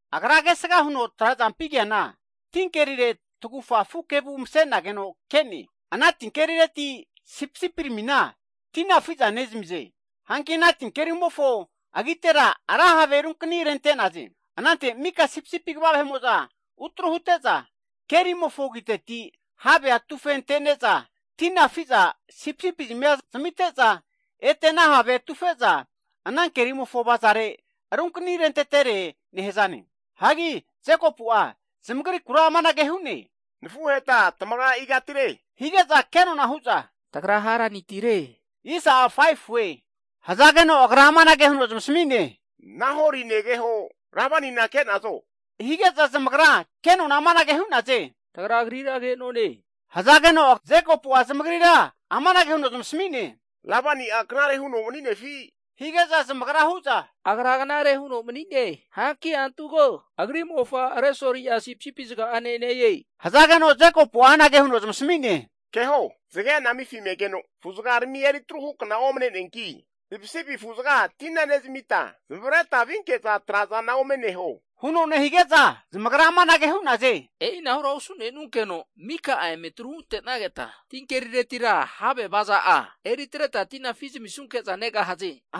Agra kesga huno trazampi keana tinkerire tagufa afu kevu masenageno ke'ne, ana tikerireti sipisipi ramina tina afi nezmize. Hanki ana kerimofo agitera ra have runkni rente'naze. Anante mika sipisipi kva vahe'mo'za utru hute'za, kerimofo agiteti havea atufe ante'ne'za, tina afi'za sipisipi zamia amite'za, ete ana havea atufe'za ana kerimofo avazare runkani rentetere nehzane. Jekopu'a zamagrikura amanage hu'ne, Nafuheta tamagra igatire hige'za? Kenona hu'za tagra Haranitire hu'naze. Agra amanage huno zamasmi'ne, Nahori negehona Labanina ke'nazo? hige'za, zamagra amanage hu'naze. Tagra agrira ke'none hu'naze. Jekopu zamagri zamasmino, Labani knare huno mani'nefi? hige'za, zamagra huza agra knare huno mani'ne, antu ko, agri'mofa Resoli sipisipi zga'ane ne-e. Jekopu'a zamasmino keho, zgea anamifi me'ne, hagi afu'zgarmina eritru hukna omne'ne, ti sipisipi nezmita zamavreta vinkeno traza neho huno nehige'za, zamagra amanage hu'naze, E'inahura osu'nenunkeno mika'a emetru hutena, tinkeri havea avaza'a eritreta tina afi zamisunke'za negahaze.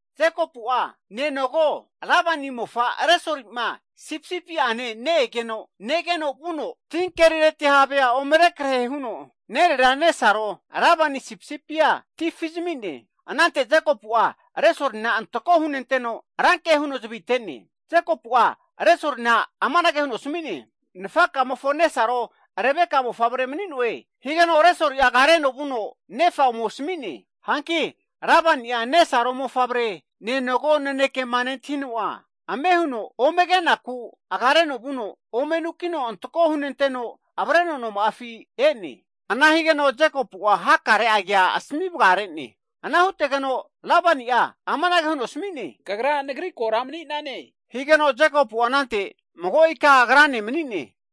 Jekopu'a nenogo Labani mofa Resoli sipisipi'ane ne-egeno, negeno Jekopu'a vuno tin kerireti havea rekrehe huno, agri nerera nesaro Labani sipisipia ti afizmi'ne. Anante Jekopu'a Resolina antako hunenteno ranke huno zvi ate'ne. Jekopu'a Resoli asmino, Nfaka'mofo nesaro Rebeka mofavre mani'noe higeno, Resoli agareno vuno nefa ome asmi'ne. Hanki Labani agri nenogo ne' mofavremofo ke nentahino, agareno ome ke'naku vuno, ome anukino antako hunenteno avreno noma'afi ene. Hanki Jekopu'a hakare kea asmi vga'rene. Lebani amanage huno asmi'ne, kagra nagri kora maninane. Jekopu anante mago ika agrane mani'ne.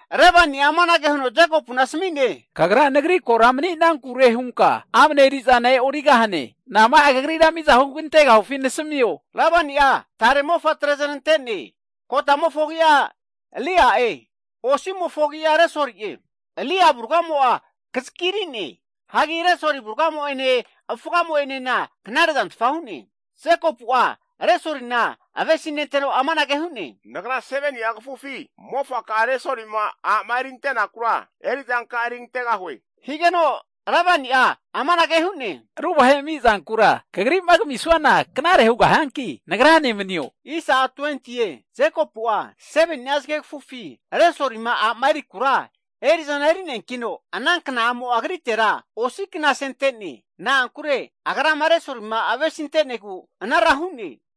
Labani amanage huno Jekopuna asmi'ne, Kagra nagri kora mani'nane, hagi amne eri'za e'origahane? Nasmio, nama'a kagrira miza hugantegahue? Labani'a tare mofatre znante'ne, kotamofo agi'a Lea'e, osi'mofo agi'a Resoli'e. Lea avurgamo'a kzagiri'ne, hagi Resoli avurgamo ene, avufgamo enena knarezantfa hu'ne. Jekopu'a Resoli avesinteno, amanage hu'ne, nagra 7ni'a kafufi osi mofaka'a Resoli erikura erizanka'a erigantegahue. Labani amanage hu'ne, Ru vahe ami'zankura kagrima kamisuana knare hu'neanki nagrane manio. Resolima a' erikura Jekopu'a 7ni'a zgegfu eri'zana eri'ne, ana kna'mo'a agritera osi knasentene, na'ankure agrama Resolima avesinte'negu ana hu'ne.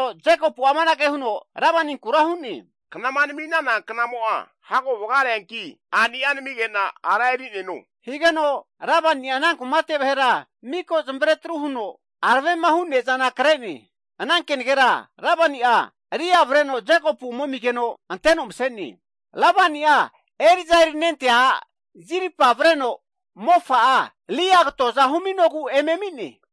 Jekopu amanage Labaniku hu'ne, Knama nmi'nana kna vga'reanki a'nia nmige'na agrane msa'neno. Labani ana kumate miko vahe zamare tru huno, ra ne'za kre'ne. Ana kenegera nefa'a Lea avreno Jekopu ome amigeno anteno mse'ne. Labani'a eri'za erinentea a' Zilpa avreno mofa'a Lea katoza huminogu eme ami'ne.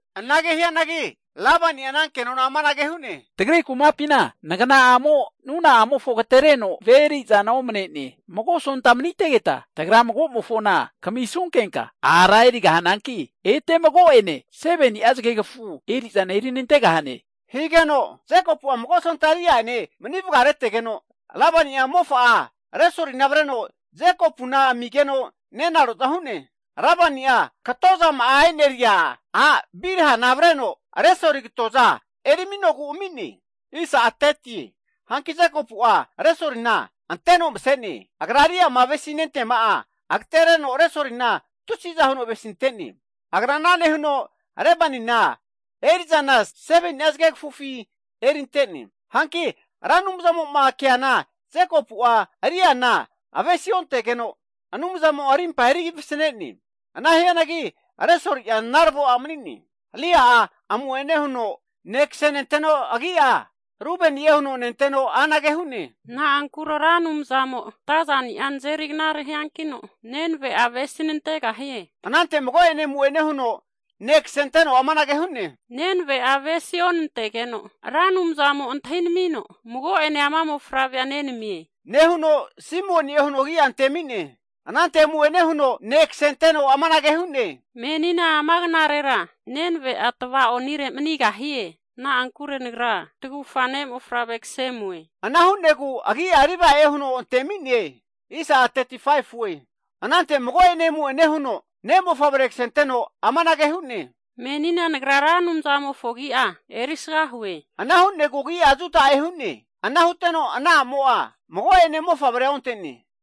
Ana hianagi Labani amanage hu'ne, tagri kumapina nagna'amo nuna'amofo agtereno ve' eri'zana omne'ne. Mago sonta manitegeta, tagra mago'mofona kamisnunkenka ete mago'ene 7ni'a zgegfu erizana eri nantegahane. Jekopu'a mago sonta Lea ene mani vgare'tegeno, Lebani mofa'a Resolina avre amigeno nenaro'za hu'ne. Labani'a, Bilha katozama'a e'neri a' avreno Resoli katoza eri aminogu ami'ne. Hanki Jekopu'a Resolina anteno mase'ne, agra Leama avesi nenteama'a agatereno Resolina rama'a avesintene, agra ana nehuno Labanina erizana 7ni'a zgegfufi erinte'ne. Hanki Ra Anumzamo keana Jekopu'a Leana avesi ontegeno, Anumzamo rimpa eri vasne'ne, ana hianagi Resoli'a narvo mani'ne. Lea amu'ene huno ne' ksenteno agi'a Rubeni'e hu'ne, agra amanage hu'ne, Na'ankure Ra Anumzamo natazani'a nazeri knare hiankino, nenave'a avesi nantegahie. Anante mago'ene amu'ene huno ne' ksenteno amanage hu'ne, Na'ankure Ra Anumzamo antahi namie, nenve avesi onantegeno. Agra mago'ene ama mofavrea nenamie nehuno, Simioni'e huno agia antemi'ne. Anante amu'ene huno ne' kasenteno amanage hu'ne, Menina ama knarera nenave'a tvaonire manigahie. Na'ankure nagra tagufa ne'mofavre kse amue. Ana hu'negu agi'a Levi'e huno antemi'ne. Anante mago'ene amu'ene huno, ne'mofavre ksenteno amanage hu'ne, Menina nagra Ra Anumzamofo agi'a erisga hue. Ana hu'negu agi'a Juda'e hu'ne. Ana huteno ana a'mo mago'ene mofavrea onte'ne.